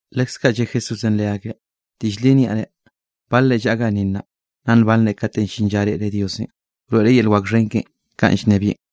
Leskaꞌ lle Jesúsenꞌ leakeꞌ: —Diꞌll li niaꞌ reꞌ, balre llaꞌa ganni nnaꞌ, nna nbanre kate llin lla reꞌre Diosenꞌ, wroeꞌ yel wak xhen keꞌen kanꞌ llnebieꞌn.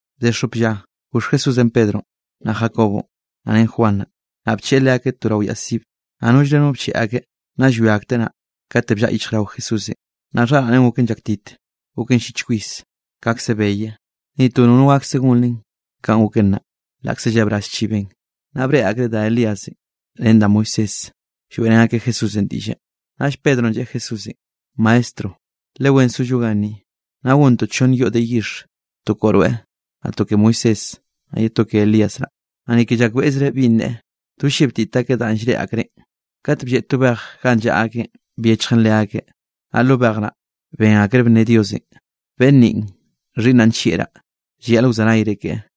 Bde xop lla, goxh Jesúsenꞌ Pedronꞌ, naꞌ Jacobonꞌ, naꞌ ren Juan naꞌ, naꞌ bcheꞌe leakeꞌ to rao yaꞌ sibe, naꞌ nollre no bcheꞌe akeꞌ. Naꞌ llwia akteꞌ naꞌ, kate bllaꞌa yichjrao Jesúsenꞌ. Naꞌ xharaꞌneꞌn goken llaktit, goken llich kwis kaꞌkze beye, ni to nono gakse gon len kanꞌ goken naꞌ, laꞌkze llebraz chiben. Naꞌ breꞌe akreꞌ da Elías ren da Moisés lloeꞌrén akeꞌ Jesúsenꞌ diꞌlle. Naꞌll Pedronꞌ lleꞌe Jesúsenꞌ: —Maestro, le wen zollo ganni. Naꞌ gontoꞌ chonn yoꞌ de yixh, to koꞌo rweꞌ, naꞌ to ke Moisés, naꞌ ye to ke Elías naꞌ. Naꞌ ni ke llakbeꞌzreꞌ binꞌ neꞌe, do llebtit akeꞌ danꞌ llreꞌe akreꞌn. Kat blleꞌ to bej ganꞌ llaꞌa akeꞌn byechjen leakeꞌ, naꞌ lo bej naꞌ, ben akreꞌ bne Diosenꞌ: —Beꞌnn ninꞌ, xhiꞌnnaꞌ nllieꞌraꞌ, llayaꞌl wzenayre keꞌe.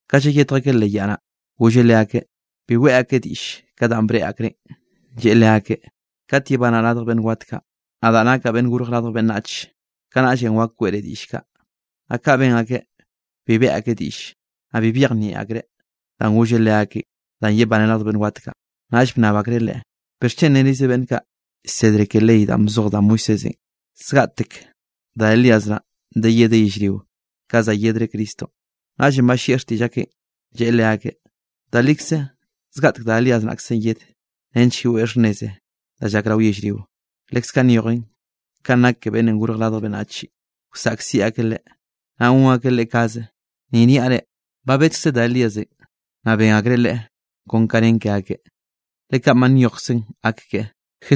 Ka llayetj akeꞌ leꞌ yaꞌ naꞌ, golleꞌ leakeꞌ bi weꞌe akeꞌ diꞌll ka danꞌ breꞌe akreꞌn, lleꞌe leakeꞌ: —Kat yebanaꞌ radj beꞌnn wat kaꞌ, nadaꞌ nakaꞌ Beꞌnn Gorj Radj Beꞌnnach, kanaꞌll wak weꞌre diꞌll kaꞌ. Naꞌ kaꞌ ben akeꞌ, bi beꞌe akeꞌ diꞌll, naꞌ bi byejnieꞌ akreꞌ danꞌ golleꞌ leakeꞌ danꞌ yebaneꞌ radj beꞌnn wat kaꞌ. Naꞌll bnnab akreꞌ Leꞌe: —¿Bixchen nerize beꞌnn kaꞌ llsedre ke ley danꞌ bzoj da Moisésenꞌ, zgaꞌtek da Elías naꞌn de yedeꞌ yellrionꞌ ka za yedre Cristonꞌ? Naꞌllenꞌ ballieꞌ xtiꞌll akeꞌn, lleꞌe leakeꞌ: —Da likzenꞌ zgaꞌtek da Elías naꞌkze yedeꞌ nench yeweꞌ xhnneze danꞌ llak rao yellrio; leskaꞌ nyojen ka nak Beꞌnnenꞌ Gorj Radj Beꞌnnachenꞌ wsaꞌkziꞌ akeꞌ Leꞌe, naꞌ gon akeꞌ Leꞌe kaze. Ni niaꞌ reꞌ, ba bedkze da Elíasenꞌ, naꞌ ben akreꞌ leꞌe kon ka nen ke akeꞌ, le kanꞌ ba nyojkzen gak keꞌe.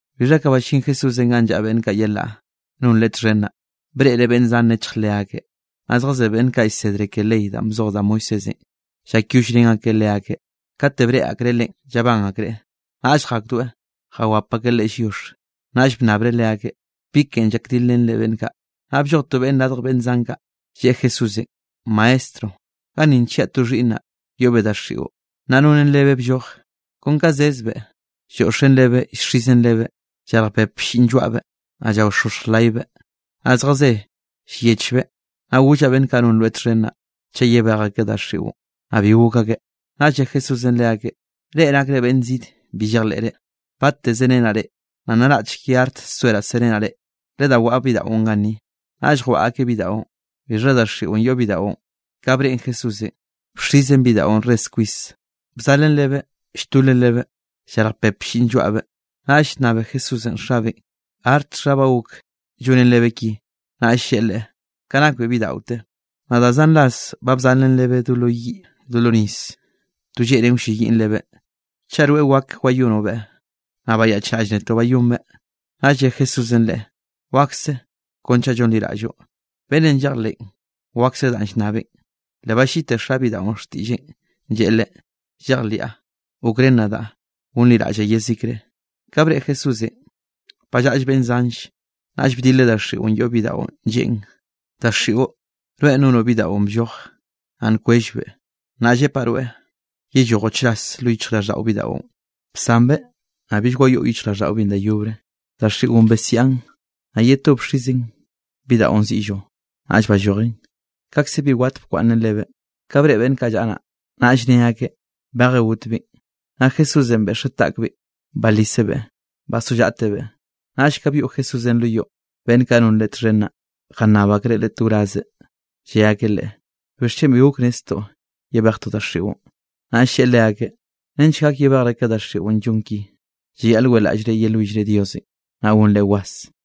Bixha ka ballín Jesúsenꞌ ganꞌ llaꞌa beꞌnn kaꞌ yelaꞌ non Leꞌe txhen naꞌ, breꞌreꞌ beꞌnn zan nechj leakeꞌ, naꞌ zjazé beꞌnn kaꞌ llsedre ke ley danꞌ bzoj da Moisésenꞌ llakyollrén akeꞌ leakeꞌ. Kate breꞌe akreꞌ Leꞌen llabán akreꞌ, naꞌll jakdoeꞌ jawap akeꞌ Leꞌe lliox. Naꞌll bnnabreꞌ leakeꞌ: —¿Bi ken llakdilrenre beꞌnn kaꞌ? Naꞌ blloj to beꞌnne radj beꞌnn zan kaꞌ, lleꞌe Jesúsenꞌ: —Maestro, ganni nchiaꞌ to xhiꞌnnaꞌ yoꞌbeꞌ daxiꞌo, naꞌ nonen lebeꞌ blloj. Kon ka zezbeꞌ lloꞌxen lebeꞌ llxizen lebeꞌ, llarj pep blliꞌn lloaꞌbeꞌ, naꞌ llaoxoxj laybeꞌ, naꞌ zjazé llyechbeꞌ. Naꞌ gollaꞌ beꞌnn kaꞌ non rweꞌ txhen naꞌ, chaꞌ yebej akeꞌ daxiꞌon, naꞌ bi gok akeꞌ. Naꞌll lle Jesúsenꞌ leakeꞌ: —¡Reꞌ nakre beꞌnn zid bi llejleꞌre! ¿Bate zerenaꞌ reꞌ? Naꞌ naraꞌchk ye arte soeraꞌ serenaꞌ reꞌ. Ledá waꞌa bidaꞌon ganni. Naꞌll jwaꞌa akeꞌ bidaꞌon, bixha daxiꞌon yoꞌ bidaꞌon, ka breꞌen Jesúsenꞌ bxizen bidaꞌon res kwis, bzalen lebeꞌ lltolen lebeꞌ, llalj pep blliꞌn lloaꞌbeꞌ. Naꞌll llnnabeꞌ Jesúsenꞌ xabeꞌn: —¿Artxha ba gok llonen lebeꞌ ki? Naꞌll lleꞌe Leꞌe: —Ka nakbeꞌ bidaꞌote. Naꞌ da zan ras ba bzalen lebeꞌ do lo yiꞌ do lo nis, to lleꞌnen wlleyiꞌn lebeꞌ. Chaꞌ rweꞌ wak wayonobeꞌ, naꞌ bayaꞌchraꞌll netoꞌ bayonbeꞌ. Naꞌll lle Jesúsenꞌ leꞌe: —Wakse kon chaꞌ llonliraꞌlloꞌ, beꞌnnenꞌ llejleꞌn wakse danꞌ llnnabeꞌn. Le balliꞌte xa bidaꞌon xtiꞌlleꞌn, lleꞌe Leꞌe: —¡Llejliaꞌ; gokrén nadaꞌ gonliraꞌllaꞌ yezikre! Ka breꞌe Jesúsenꞌ ba llaꞌll beꞌnn zanlle, naꞌll bdileꞌ daxiꞌon yoꞌ bidaꞌon lleꞌen: —Daxiꞌo, rweꞌn nonoꞌ bidaꞌon blloje naꞌ nkwellbeꞌ, naꞌ llepaꞌ rweꞌ yellojoꞌ chras lo yichjraꞌlldaꞌo bidaꞌon. Bsanbeꞌ, naꞌ bill wayoꞌ yichjraꞌlldaꞌobeꞌn da yobre. Daxiꞌon besiaꞌn, naꞌ ye to bxizen bidaꞌon ziꞌllo, naꞌll ballojen; kaꞌkze bi wat bkwaꞌnnen lebeꞌ. Ka breꞌe beꞌnn kaꞌ llaꞌa naꞌ, naꞌll ne akeꞌ: —Baje gotbeꞌn. Naꞌ Jesúsenꞌ beꞌxeꞌ taꞌkbeꞌn balisebeꞌ, bazollaꞌtebeꞌ. Naꞌll ka byoꞌ Jesúsenꞌ lo yoꞌ, beꞌnn kaꞌ non Leꞌe txhen naꞌ, jannab akreꞌ Leꞌe to wrazeꞌ, lle akeꞌ Leꞌe: —¿Bixchen bi gok netztoꞌ yebejtoꞌ daxiꞌon? Naꞌll lleꞌe leakeꞌ: —Nench gak yebejre ka daxiꞌon llon ki, llayaꞌl weꞌlaꞌllre yelwillre Diosenꞌ naꞌ gonre was.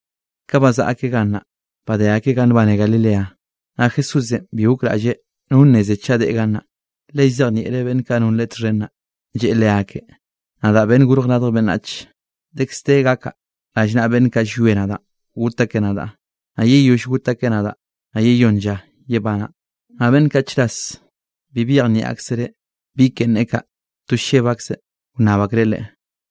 Ka bazaꞌa akeꞌ gannaꞌ, badé akeꞌ ganꞌ nbane Galilea, naꞌ Jesúsenꞌ bi gokraꞌlleꞌ no nneze chaꞌ deꞌe gannaꞌ. Le llzejnieꞌreꞌ beꞌnn kaꞌ non Leꞌe txhen naꞌ, lleꞌe leakeꞌ: —Nadaꞌ Beꞌnnenꞌ Gorj Radj Beꞌnnach, dekz de gakaꞌ rallnaꞌa beꞌnne kaꞌ llwie nadaꞌ got akeꞌ nadaꞌ, naꞌ yeyoll got akeꞌ nadaꞌ, naꞌ yeyónn lla yebanaꞌ. Naꞌ beꞌnn kaꞌ chras bi byejnieꞌ aksereꞌ bi ken neꞌe kaꞌ, to lleb akzeꞌ wnnab akreꞌ Leꞌe.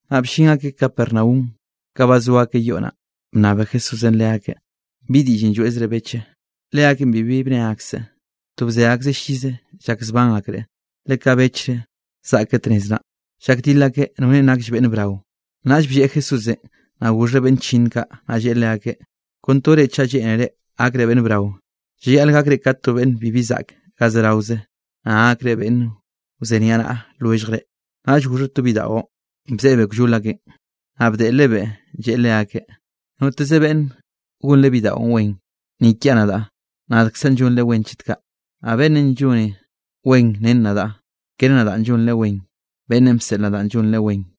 Naꞌ bllin akeꞌ Capernaum, ka ba zo akeꞌ yoꞌ naꞌ, bnnabe Jesúsenꞌ leakeꞌ: —¿Bi diꞌllenꞌ lloeꞌzre beche? Leakeꞌn bibi bne akseꞌ, to bze akeꞌ llize llak zban akreꞌ, le ka bechre zaꞌke tnez naꞌn, llakdil akeꞌ norenꞌ nakll beꞌnn brao. Naꞌll blleꞌ Jesúsenꞌ, naꞌ goxheꞌ beꞌnn chllinn kaꞌ, naꞌ lleꞌe leakeꞌ: —Kon to reꞌ chaꞌ lleꞌnere gakre beꞌnn brao, llayaꞌl gakre ka to beꞌnn bibi zaꞌke ga zeraoze, naꞌ gakre beꞌnn wzeniaꞌnaꞌa lwelljre. Naꞌll goxheꞌ to bidaꞌo, bzeꞌebeꞌ kllol akeꞌn, naꞌ bdeꞌlebeꞌ lleꞌe leakeꞌ: —Noteze beꞌnne gonre bidaꞌo wen, ni kiaꞌ nadaꞌ, nadkzaꞌn llonreꞌ wen chet kaꞌ, naꞌ beꞌnne lloneꞌ wen ren nadaꞌ, kere nadaꞌn llonreꞌ wen, beꞌnnenꞌ bseꞌl nadaꞌn llonreꞌ wen.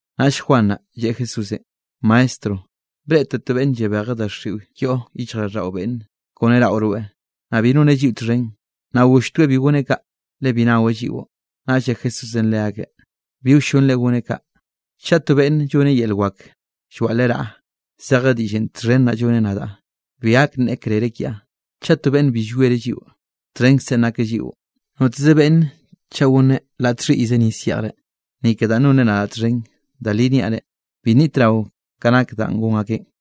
Naꞌll Juan naꞌ, lleꞌe Jesúsenꞌ: —Maestro, breꞌtoꞌ to beꞌnn llabejeꞌ daxiꞌo yoꞌ yichjraꞌlldaꞌo beꞌnne kone raꞌo rweꞌ, naꞌ bi noneꞌ lliꞌo txhen, naꞌ golltoeꞌ bi goneꞌ kaꞌ, le bi naweꞌ lliꞌo. Naꞌll lle Jesúsenꞌ leakeꞌ: —Bi wllonre goneꞌ kaꞌ, chaꞌ to beꞌnne lloneꞌ yel wak llwaꞌleꞌ raꞌa, zeje diꞌll txhen naꞌ lloneꞌ nadaꞌ, bi gak nneꞌe krere kiaꞌ. Chaꞌ to beꞌnne bi llwiereꞌ lliꞌo, txhenkzenꞌ nakeꞌ lliꞌo. Noteze beꞌnne chaꞌ gonneꞌ laꞌ txhiꞌyze nis yeꞌjre, ni ke danꞌ nonre nadaꞌ txhen, da li niaꞌ reꞌ, bi nnitrao ka nake danꞌ gon akeꞌn.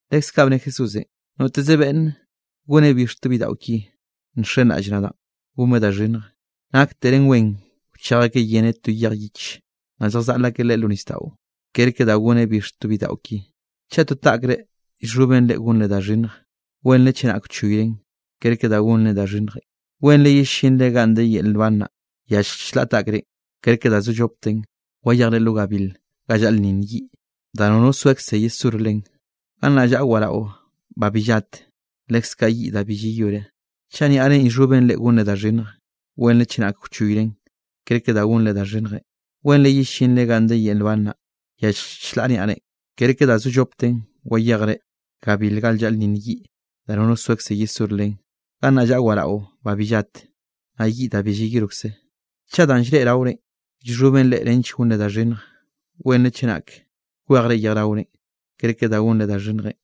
Leskaꞌ bne Jesúsenꞌ: —Noteze beꞌnn goneꞌ bix to bidaꞌo ki nxenraꞌll nadaꞌ gonbeꞌ da xhinnjenꞌ, naktere wen wchej akeꞌ yeneꞌ to yej yich, naꞌ lljazaꞌl akeꞌ leꞌe lo nisdaꞌo, kerke da goneꞌ bix to bidaꞌo ki. Chaꞌ to taꞌkre llxhoben reꞌ gonre da xhinnjenꞌ, wenre chenak wchoyren, kerke da gonre da xhinnjenꞌ, wenre yellinre ganꞌ de yel nban naꞌ, yallj chlaꞌ taꞌkrenꞌ, kerke da zo llopten wayejre lo gabil ga llaꞌlnninn yiꞌ da nono soekze yesor len. Gannaꞌ llaꞌa waraꞌo ba bi llat, leskaꞌ yiꞌ da bi llayore. Chaꞌ niaꞌrenꞌ llxhoben reꞌ gonre da xhinnjenꞌ, wenre chenak wchoyren, kerke da gonre da xhinnjenꞌ, wenre yellinre ganꞌ de yel nban naꞌ, yallj chlaꞌ niaꞌre, kerke da zo llopten wayejre gabil ga llaꞌlnninn yiꞌ da nono soekze yesor len. Gannaꞌ llaꞌa waraꞌo ba bi llat, naꞌ yiꞌ da bi llayorkze. Chaꞌ danꞌ llreꞌe raorenꞌ llxhoben reꞌ nench gonre da xhinnjenꞌ, wenre chenak kwejre yejraorenꞌ, kerke da gonre da xhinnjenꞌ,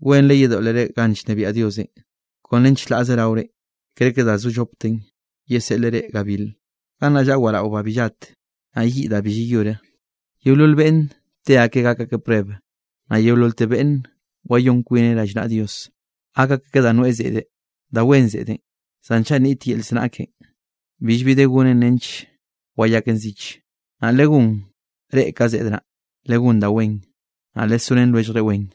wenre yedoꞌlere ganꞌ llnebiaꞌ Diosenꞌ kon ren chlaꞌze raorenꞌ, kerke da zo llopten yeseꞌleꞌ reꞌ gabil. Gannaꞌ llaꞌa waraꞌo ba bi llat, naꞌ yiꞌ da bi llayore. ’Yeolol beꞌnne te akeꞌ gak akeꞌ prueb, naꞌ yeololte beꞌnn wayón kwineꞌ rallnaꞌa Dios, gak akeꞌ ka da nweꞌe zeꞌde. Da wen zeꞌdenꞌ, zan chaꞌ nit yel znaꞌ ken, billbi de gonre nench wayaken zich. Naꞌ legón reꞌ ka zeꞌd naꞌ, legón da wen, naꞌ lesorén lwelljre wen.